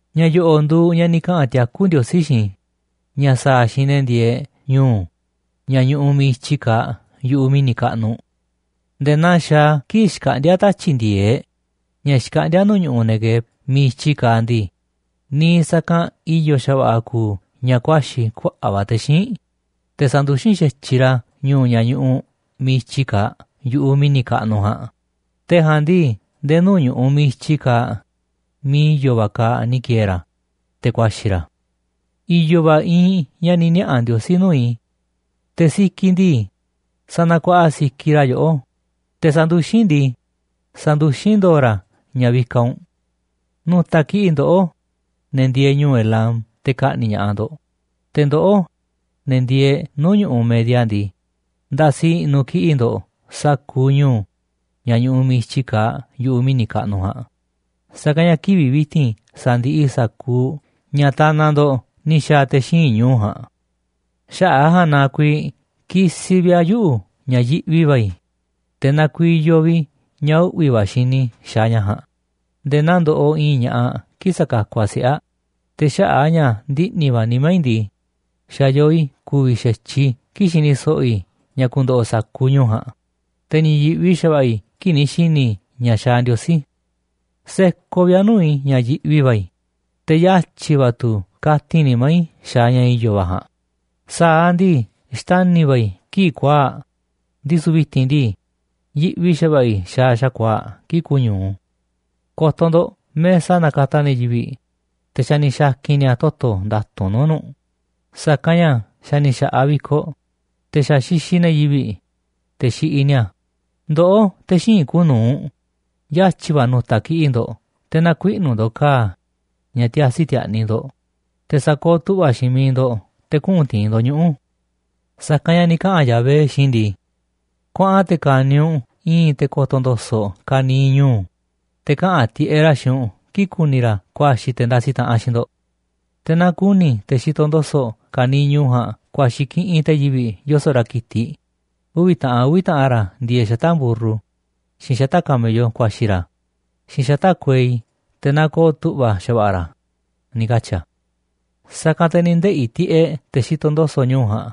Ña̱ yo̱ꞌo̱ꞌ nduuꞌ ña̱ ni̱ kaꞌa̱n tiakú Ndiosí xiinꞌ i̱ ña̱ sa̱a̱ a̱ xiinꞌ ne̱ ndieeꞌ ñu̱u̱ ña̱ ñuꞌuꞌ miiꞌ i̱tyi kaaꞌ yu̱ꞌuꞌ mi̱ni̱ kaꞌnuꞌ: Nde̱e̱ naa xaaꞌ a̱ kii̱ꞌ xkaꞌndíá tatyi̱ꞌ ndi̱e̱eꞌ ña̱ xkaꞌndíá nuu̱ꞌ ñu̱ꞌuꞌ Neguev miiꞌ i̱tyi kaaꞌ ndii, niiꞌ sa̱kanꞌ i̱yo̱ xa̱va̱ꞌa̱ kuuꞌ ña̱ ku̱a̱xi̱ kuaꞌa̱ꞌ va̱ te̱ xíinꞌ, te̱ sa̱nduxín xa̱tyiꞌ ra̱ ñu̱u̱ ña̱ ñuꞌuꞌ miiꞌ i̱tyi kaaꞌ yu̱ꞌuꞌ mi̱ni̱ kaꞌnuꞌ ja̱a̱nꞌ, te̱ ja̱a̱nꞌ ndii nde̱e̱ nuu̱ꞌ ñu̱ꞌuꞌ miiꞌ i̱tyi kaaꞌ miiꞌ i̱yo̱ va̱ kaaꞌ ni̱ ki̱e̱e̱ ra̱, te̱ ku̱a̱xi̱ ra̱. I̱yo̱ va̱ iinꞌ ña̱ ni̱ niaꞌa̱ Ndiosí nuu̱ꞌ i̱. Te̱ sikiꞌ ndii, sanakuaꞌa sikiꞌ ra̱ yoꞌó, te̱ sanduxín ndii, sanduxín ndo̱o̱ ra̱ ña̱ vikaꞌ u̱nꞌ. Nu̱ta̱ kiꞌi̱ꞌ ndoꞌó, ne̱ ndieeꞌ ñu̱u̱ Elam, te̱ ka̱ꞌni̱ꞌ ña̱ꞌaꞌ ndo̱ꞌ. Te̱ ndoꞌó, ne̱ ndieeꞌ nuu̱ꞌ ñu̱ꞌuꞌ Media ndii, nda̱si̱ i̱ꞌnu̱ kiꞌi̱ꞌ ndo̱ꞌ sa̱kuuꞌ ñu̱u̱ ña̱ ñuꞌuꞌ miiꞌ i̱tyi kaaꞌ yu̱ꞌuꞌ mi̱ni̱ kaꞌnuꞌ ja̱a̱nꞌ, sa̱kanꞌ ña̱ kivi̱ꞌ vi̱ti̱n sa̱ndiꞌiꞌ i̱ sa̱kuuꞌ ña̱ tanaꞌ ndo̱ꞌ ni̱ xa̱a̱ te̱ xíinꞌ ñu̱u̱ ja̱a̱nꞌ. Xaꞌa̱ꞌ a̱ ja̱a̱nꞌ na kuiiꞌ kisiꞌ vi̱ꞌ a̱ yuꞌu̱ ña̱ yiꞌvi va̱ i̱, te̱ nakuiyoꞌ vi̱ꞌ i̱ ña̱ uꞌvi̱ va̱ xini i̱ xaaꞌ ña̱ ja̱a̱nꞌ nde̱e̱ naa ndoꞌoꞌ i̱i̱n ña̱ꞌaꞌ kii̱ꞌ sakakuꞌ aꞌ siꞌe̱ aꞌ. Te̱ xaꞌa̱ꞌ a̱ ña̱ ndiꞌni̱ va̱ nimá i̱ ndii, xa̱ yoo i̱ ku̱vi̱ xa̱tyiꞌ i̱ kii̱ꞌ xini so̱ꞌo̱ i̱ ña̱ ku̱ndo̱ꞌo̱ sa̱kuuꞌ ñu̱u̱ ja̱a̱nꞌ, te̱ ni̱ yi̱ꞌvi xa̱va̱ꞌa̱ i̱ kii̱ꞌ ni̱ xi̱ni̱ i̱ ña̱ xaaꞌ Ndiosí. Sekoꞌ vi̱ꞌ a̱ nuu̱ꞌ i̱ ña̱ yiꞌvi va̱ i̱, te̱ yatyi̱ va̱ tu̱ katin nimá i̱ xaaꞌ ña̱ i̱yo̱ va̱ ja̱a̱nꞌ. Sa̱aꞌ ndii xtani̱ va̱ i̱ kii̱ꞌ kuaa̱ꞌ, ndisu̱ vi̱ti̱n ndii, yiꞌvi xa̱va̱ꞌa̱ i̱ xaaꞌ xa̱kuaa̱ꞌ kii̱ꞌ kuñu̱u. Ko̱to̱ ndo̱ꞌ mesa nakataꞌ ne̱ yivi̱ꞌ, te̱ xa̱ ni̱ xa̱ki̱n ni̱a̱ toto̱ nda̱tu̱nꞌ nuu̱ꞌ nu̱ꞌ, sa̱kanꞌ ña̱ xa̱ ni̱ xa̱ꞌaꞌ vi̱koꞌ, te̱ xa̱ xixiꞌ ne̱ yivi̱ꞌ, te̱ xiꞌiꞌ ni̱a̱. Ndoꞌó, te̱ xíinꞌ kuuꞌ nu̱uꞌ, yatyi̱ va̱ nu̱ta̱ kiꞌi̱ꞌ ndo̱ꞌ te̱ na̱kuiꞌnu̱ ndo̱ꞌ ka̱a̱ ña̱ tiasi ti̱a̱ꞌni̱ ndo̱ꞌ, te̱ sa̱kooꞌ tu̱ꞌva̱ xiinꞌ miiꞌ ndo̱ꞌ te̱ kuꞌu̱n ti̱i̱n ndo̱ꞌ ñuꞌu̱. Sa̱kanꞌ ña̱ ni̱ kaꞌa̱n Yahvé xiinꞌ i̱ ndii: “Kuaꞌan te̱ ka̱ni̱ u̱nꞌ i̱i̱n te̱ ko̱to̱ ndo̱so̱ꞌ ka̱niiꞌ ñu̱u̱, te̱ kaꞌa̱n tiꞌeꞌ ra̱ xiinꞌ u̱nꞌ kii̱ꞌ ku̱ni̱ ra̱ ku̱a̱xi̱ te̱ ndasiꞌ taꞌanꞌ xiinꞌ ndo̱ꞌ. Te̱ naaꞌ ku̱ni̱ te̱ xitoꞌ ndo̱so̱ꞌ ka̱niiꞌ ñu̱u̱ ja̱a̱nꞌ ku̱a̱xi̱ kiꞌinꞌ te̱ yivi̱ꞌ yoso̱ꞌ ra̱ ki̱tiꞌ, uvi̱ taꞌan uvi̱ taꞌan ra̱ ndieeꞌ xata̱ꞌ mburru, xiinꞌ xata̱ꞌ camello ku̱a̱xi̱ ra̱, xiinꞌ xata̱ꞌ kuei, te̱ na ko̱o̱ tu̱ꞌva̱ xa̱va̱ꞌa̱ ra̱”, ni̱ katyi̱ a̱. Sa̱kanꞌ te̱ ni̱ ndeꞌi̱ tiꞌeꞌ te̱ xitoꞌ ndo̱so̱ꞌ ñu̱u̱ ja̱a̱nꞌ,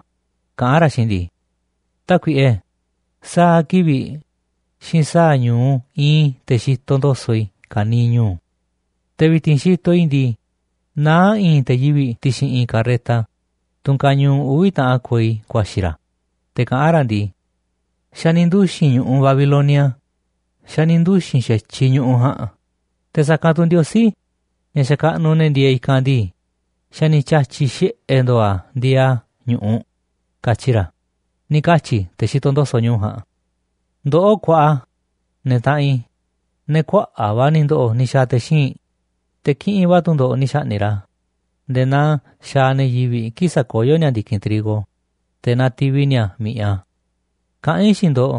kaꞌán ra̱ xiinꞌ i̱ ndii: “Tákuiꞌe, sa̱a̱ kivi̱ꞌ xiinꞌ sa̱a̱ ñu̱u iinꞌ i̱ te̱ xitoꞌ ndo̱so̱ꞌ i̱ ka̱niiꞌ ñu̱u̱. Te̱ vi̱ti̱n xitoꞌ i̱ ndii, naá i̱i̱n te̱ yivi̱ꞌ ti̱xi̱n i̱i̱n karreta, tunꞌ kañuuꞌ uvi̱ taꞌan kuei ku̱a̱xi̱ ra̱, te̱ kaꞌán ra̱ ndii: Xa̱ ni̱ nduxi̱n ñu̱ꞌuꞌ Babilonia, xa̱ ni̱ nduxi̱n xa̱tyiꞌ ñu̱ꞌuꞌ ja̱a̱nꞌ. Te̱ sa̱kanꞌ tu̱ ndiosí ña̱ xakaꞌnuꞌ ne̱ ndieeꞌ i̱kanꞌ ndii, xa̱ ni̱ tya̱tyi̱ xiꞌe̱ ndo̱o̱ a̱ ndieeꞌ a̱ ñu̱ꞌuꞌ, katyi ra̱”, ni̱ katyi̱ te̱ xitoꞌ ndo̱so̱ꞌ ja̱a̱nꞌ. Ndoꞌó kuaꞌa, ne̱ taꞌanꞌ i̱, ne̱ kuaꞌa̱ꞌ va̱ ni̱ ndo̱ꞌo̱ ni̱ xa̱a̱ te̱ xíinꞌ, te̱ kiꞌinꞌ va̱ tu̱ ndo̱ꞌ ni̱ xa̱ꞌni̱ꞌ ra̱ nde̱e̱ naa xaaꞌ ne̱ yivi̱ꞌ kii̱ꞌ sakoyó ni̱a̱ ndi̱kinꞌ trigo, te̱ nativi ni̱a̱ mi̱ꞌiꞌ a̱. Kaꞌán i̱ xiinꞌ ndo̱ꞌ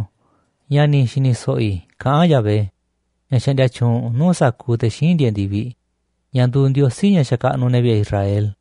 ña̱ ni̱ xi̱ni̱ so̱ꞌo̱ i̱ kaꞌán Yahvé, ña̱ xaꞌndia tyuunꞌ nuu̱ꞌ sa̱kuuꞌ te̱ xíinꞌ ndieeꞌ ndi̱viꞌ, ña̱ nduuꞌ Ndiosí ña̱ xakaꞌnuꞌ ne̱ vi̱ꞌe̱ Israel.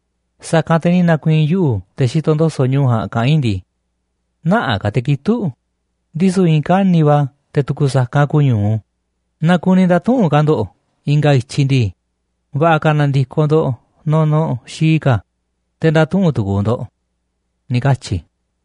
Sa̱kanꞌ te̱ ni̱ na̱ku̱i̱i̱n yuꞌu̱ꞌ te̱ xitoꞌ ndo̱so̱ꞌ ñu̱u̱ ja̱a̱nꞌ kaꞌán i̱ ndii: “Nä̱ꞌaꞌ ka̱ te̱ kitu̱ꞌ, ndisu̱ i̱i̱n kani̱ꞌ va̱ te̱ tu̱ku̱ sa̱kanꞌ kuñu̱u naaꞌ kuni nda̱tuꞌu̱nꞌ ka̱ ndo̱ꞌ i̱nga̱ i̱tyiꞌ ndii, va̱ꞌa̱ ka̱ na̱ndi̱koꞌ ndo̱ꞌ nunuꞌ xii ka̱, te̱ nda̱tuꞌu̱nꞌ tu̱ku̱u̱ ndo̱ꞌ”, ni̱ katyi i̱.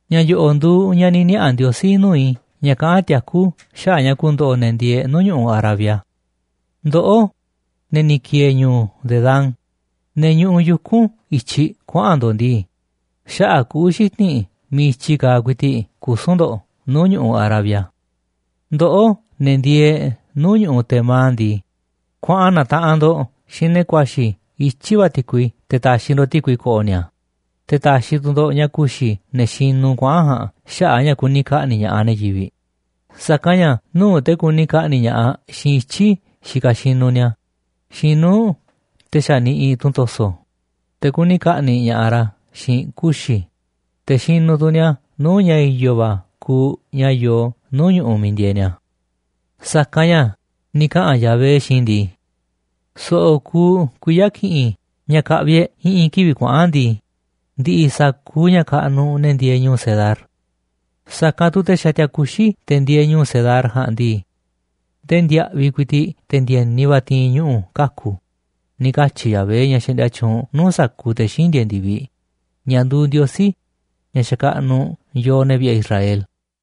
Ña̱ yo̱ꞌo̱ꞌ nduuꞌ ña̱ ni̱ niaꞌa̱ Ndiosí nuu̱ꞌ i̱ ña̱ kaꞌán tiakú xaꞌa̱ꞌ ña̱ ku̱ndo̱ꞌo̱ ne̱ ndieeꞌ nuu̱ꞌ ñu̱ꞌuꞌ Arabia. Ndoꞌó, ne̱ ni̱ ki̱e̱e̱ ñu̱u̱ Dedán, ne̱ ñuꞌuꞌ yuku̱n i̱tyiꞌ kuaꞌa̱n ndo̱ꞌ ndii, xaꞌa̱ꞌ kuꞌu̱ xiti̱nꞌ miiꞌ i̱tyiꞌ kaaꞌ ku̱i̱ti̱ꞌ kusu̱n ndo̱ꞌ nuu̱ꞌ ñu̱ꞌuꞌ Arabia. Ndoꞌó, ne̱ ndieeꞌ nuu̱ꞌ ñu̱ꞌuꞌ Tema ndii, kuaꞌan na̱taꞌanꞌ ndo̱ꞌ xiinꞌ ne̱ ku̱a̱xi̱ i̱tyiꞌ va̱ ti̱kui te̱ ta̱xi̱ ndo̱ꞌ ti̱kui ko̱ꞌo̱ ni̱a̱. Te̱ ta̱xi̱ tu̱ ndo̱ꞌ ña̱ ku̱xi̱ ne̱ xinuꞌ kuaꞌa̱n ja̱a̱nꞌ xaꞌa̱ꞌ a̱ ña̱ kuni ka̱ꞌni̱ꞌ ña̱ꞌaꞌ ne̱ yivi̱ꞌ. Sa̱kanꞌ ña̱ nuu̱ꞌ te̱ kuni ka̱ꞌni̱ꞌ ña̱ꞌaꞌ xiinꞌ ityi̱ xikaꞌ xinuꞌ ni̱a̱ xiinꞌ nuu̱ꞌ te̱ xa̱ niꞌiꞌ tunꞌ to̱so̱, te̱ kuni ka̱ꞌni̱ꞌ ña̱ꞌaꞌ ra̱ xiinꞌ kuxi̱, te̱ xinuꞌ tu̱ ni̱a̱ nuu̱ꞌ ña̱ i̱yo̱ va̱ kuuꞌ ña̱ yoo nuu̱ꞌ ñu̱ꞌuꞌ miiꞌ ndieeꞌ ni̱a̱. Sa̱kanꞌ ña̱ ni̱ kaꞌa̱n Yahvé xiinꞌ i̱ ndii: “So̱ꞌo̱ kuuꞌ kuiya̱ ki̱ꞌi̱n ña̱ ka̱ꞌvi̱ e̱ꞌ i̱ꞌi̱n kivi̱ꞌ kuaꞌa̱n ndii, ndi̱ꞌi̱ sa̱kuuꞌ ña̱ kaꞌnuꞌ ne̱ ndieeꞌ ñu̱u̱ Cedar. Sa̱kanꞌ tu̱ te̱ xatia kuxi̱ te̱ ndieeꞌ ñu̱u̱ Cedar ja̱a̱nꞌ ndii, ndee ndiaꞌviꞌ ku̱i̱ti̱ꞌ te̱ ndi̱e̱ni va̱ ti̱i̱n ñuꞌu̱ kaku̱”, ni̱ katyi̱ Yahvé, ña̱ xaꞌndia tyuunꞌ nuu̱ꞌ sa̱kuuꞌ te̱ xíinꞌ ndieeꞌ ndi̱viꞌ, ña̱ nduuꞌ Ndiosí, ña̱ xakaꞌnuꞌ yooꞌ, ne̱ vi̱ꞌe̱ Israel.